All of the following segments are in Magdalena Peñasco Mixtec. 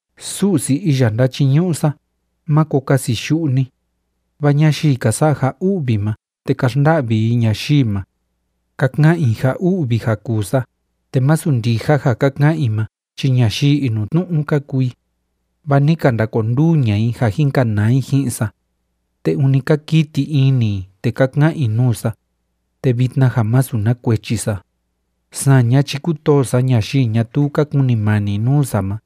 Su'si iya ndáchiñu'u sa, máko kasi yu'u ni. Vaa ñayii ka sa'a ja u'vi ma te ka xnda'vi i ñayii ma, ka ka'an i ja u'vi ja kuu sa, te masu ndija ja ka ka'an i ma chi ñayii inutnu'u ka kuu i. Vaa ni ka ndakonduu ña'a i ja jin kanaa i ji'in sa, te ûni ka kiti ini i te ka ka'an i nuu sa, te vitna ja masu na kuechi sa. Saña chi kútoo sa ñayii ñatuu ka kunimani nuu sa ma,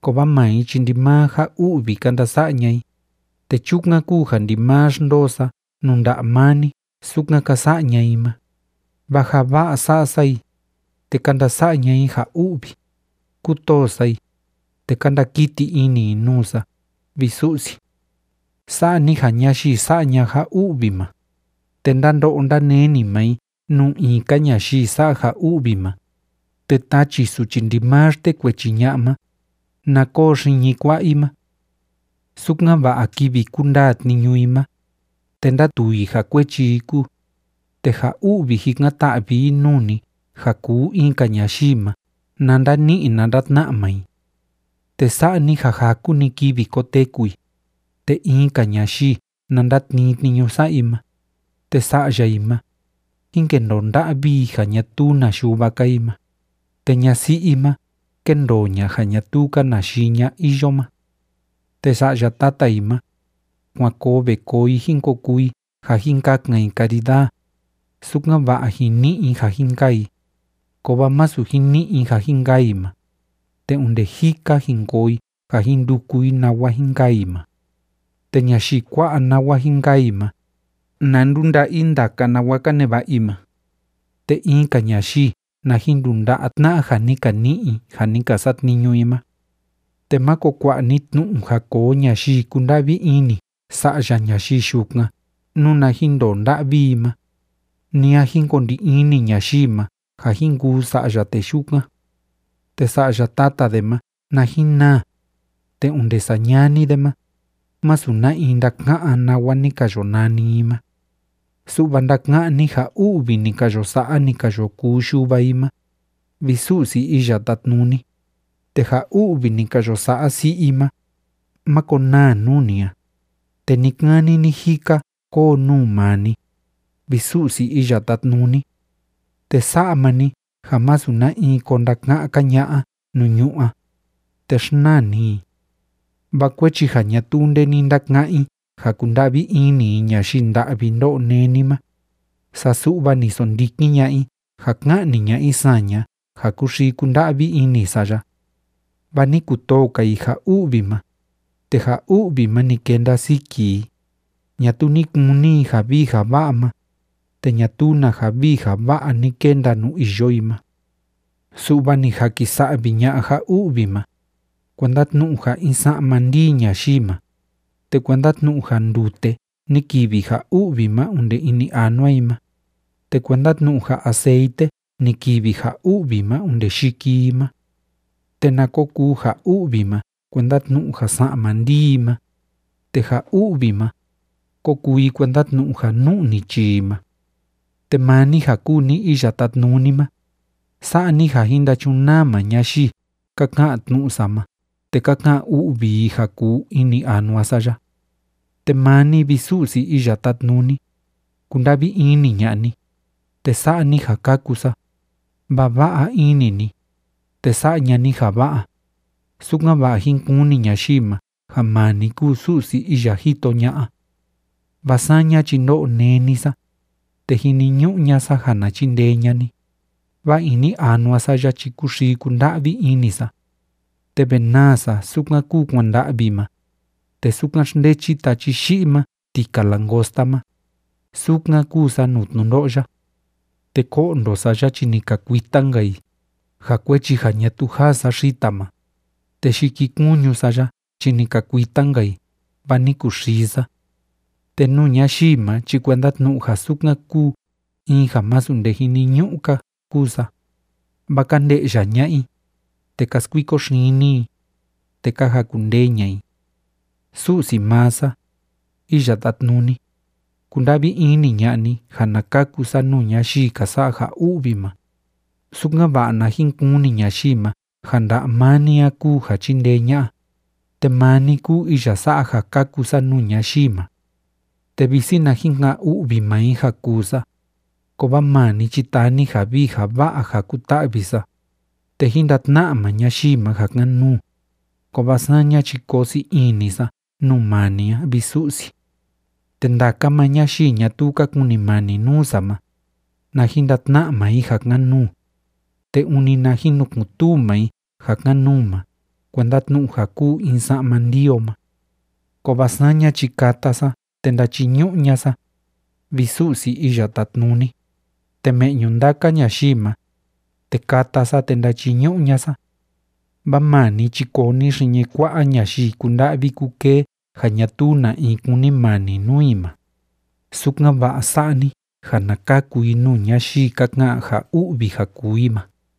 kovaa maa i chi ndimaa ja u'vi ka ndasa'a ña'a i, te chukan kúu ja ndimaa xndoo sa nuu nda'a maa ni sukan ka sa'a ña'a i ma. Vaa ja va'a sa'a sa i, te ka ndasa'a ña'a i ja u'vi. Kútoo sa i, te ka ndakiti ini i nuu sa, vi Su'si. Sa'a ni ja ñayii sa'a ña'a ja u'vi ma, te ndándo'o ndáneni maa i nuu in‑ka ñayii sa'a ja u'vi ma, te tachi suchi ndimaa xtekuechi ña'a ma, na koo xiñi kua'a i ma, sukan‑va'a kivi kundaa tniñu i ma, te ndátuu i ja kuechi i kúu, te ja u'vi jikan‑ta'vi i nuu ni ja kuu in‑ka ñayii ma na ndani'i na ndatna'a maa i. Te sa'a ni ja jaku‑ni kivi koteku i, te in‑ka ñayii na ndatnii tniñu sa'a i ma. Te sa'ya i ma, jín kendoo nda'vi i ja ñatuu na yuva‑ka i ma, te ñasi'i i ma, kéndoo ña ja ñatuu‑ka na yii ña iyo ma. Te sa'ya tata i ma, kuan koo ve koo i jín ko kuu i ja jin kakan i karidaa, sukan‑va'a jin ni'i i ja jin kaa i, kovaa masu jin ni'i i ja jin kaa i ma, te onde jika jin koo i ja jin nduku i nawa jin kaa i ma. Te ñayii kua'a nawa jin kaa i ma, na ndunda'a i ndaka nawa ka neva'a i ma, te in‑ka ñayii na jin ndunda'a tna'a ja ni ka ni'i i ja ni ka satniñu i ma. Te máko kua'a ni tnu'u ja koo ñayii kunda'vi ini sa'ya ñayii yukan nuna jin ndoo nda'vi i ma, ni a jin ko ndi ini ñayii ma ja jin kuu sa'ya tee yukan. Te sa'ya tata de ma na jin naa, te onde sañani de ma, masu na in ndaka'án nawa ni ka yo nani i ma. Su'va ndaka'án ni ja u'vi ni ka yo sa'a, ni ka yo kuu yuva i ma, vi Su'si Iya Tátnuni, te ja u'vi ni ka yo sa'a si'i i ma, máko naa nuu ni a, te ni‑kani ni‑jika kóo nuu maa ni, vi Su'si Iya Tátnuni. Te sa'a maa ni ja masu na in ko ndaka'án‑ka ña'a nuu ñu'ú a, te xnaa ni i. Vaa kuechi ja ñatuu nde ni ndaka'án i ja kunda'vi ini i ñayii nda'vi ndó'o néni ma, saa su'va ni sondikin ña'a i ja ka'ni ña'a i saña ja kúxii kúnda'vi ini sa ya. Vaa ni kutoo‑ka i ja u'vi ma, te ja u'vi ma ni kenda siki i. Ñatuu ni kuni i ja vii ja va'a ma, te ñatuu na ja vii ja va'a ni kenda nuu iyo i ma. Su'va ni jakisa'vi ña'a ja u'vi ma, kuenda tnu'u ja in sa'ma ndii ñayii ma, te kuenda tnu'u ja ndute ni kivi ja u'vi ma onde ini anua i ma, te kuenda tnu'u ja aceite ni kivi ja u'vi ma onde yiki i ma. Te na ko kuu ja u'vi ma kuenda tnu'u ja sa'ma ndii i ma, te ja u'vi ma, kó kuu i kuenda tnu'u ja nu'ni chii i ma. Te maa ni ja kúu ni Iya Tátnuni ma, sa'a ni ja jín ndachunaa maa ñayii ka ka'an tnu'u sa ma te ka ka'an u'vi i ja kuu ini anua sa ya. Te maa ni, vi Su'si Iya Tátnuni, kunda'vi ini ña'a ni, te sa'a ni ja kaku sa, vaa va'a ini ni, te sa'a ña'a ni ja va'a, sukan‑va'a jín kuni ñayii ma ja maa ni kúu Su'si iya jito ña'a. Vaa saña chi ndó'o néni sa, te jiniñu'u ña'a sa ja na chindee ña'a ni, vaa ini anua sa ya chi kúxii kúnda'vi ini sa. Te ve naa sa sukan kúu kuanda'vi ma, te sukan xndechi tachi yi'i ma tika langosta ma, sukan kúu sa nuu tnundo'o ya. Te ko'ndo sa ya chi ni ka kuita‑nka i ja kuechi ja ñatuu jaa sa xita ma, te yikikuñu sa ya chi ni ka kuita‑nka i, vaa ni kuxii sa. Te nuu ñayii ma chi kuenda tnu'u ja sukan kúu in ja masu nde jiniñu'u‑ka kúu sa, vaa ka nde'ya ña'a i, te ka skuiko xini i, te ka jakundee ña'a i. Su'si maa sa, Iya Tátnuni, kunda'vi ini ña'a ni ja na kaku sa nuu ñayii ka sa'a ja u'vi ma, sukan‑va'a na jin kuni ñayii ma ja nda'a maa ni a kúu ja chíndee ña'a, te maa ni kúu iya sa'a ja kaku sa nuu ñayii ma. Te visi na jin ka'an u'vi maa i ja kuu sa, kovaa maa ni chi taa ni ja vii ja va'a ja kuta'vi sa, te jín ndatna'a maa ñayii ma ja kan‑nuu, kovaa saña chi koo sii ini sa nuu maa ni a, vi Su'si. Te ndaka maa ñayii ñatuu ka kunimani nuu sa ma, na jin ndatna'a maa i ja kan‑nuu, te ûni na jin nukun‑tuu maa i ja kan‑nuu ma kuenda tnu'u ja kúu in sa'ma ndii o ma. Kovaa saña chi kata sa te ndachiñu'u ña'a sa, vi Su'si Iya Tátnuni, te me'ñu ndaka ñayii ma, te kata sa te ndachiñu'u ña'a sa. Vaa maa ni chi koo ni xiñi kua'a ñayii kúnda'vi kúkee ja ñatuu na in kunimani nuu i ma, sukan‑va'a sa'a ni ja na kaku i nuu ñayii ka ka'an ja u'vi ja kuu i ma.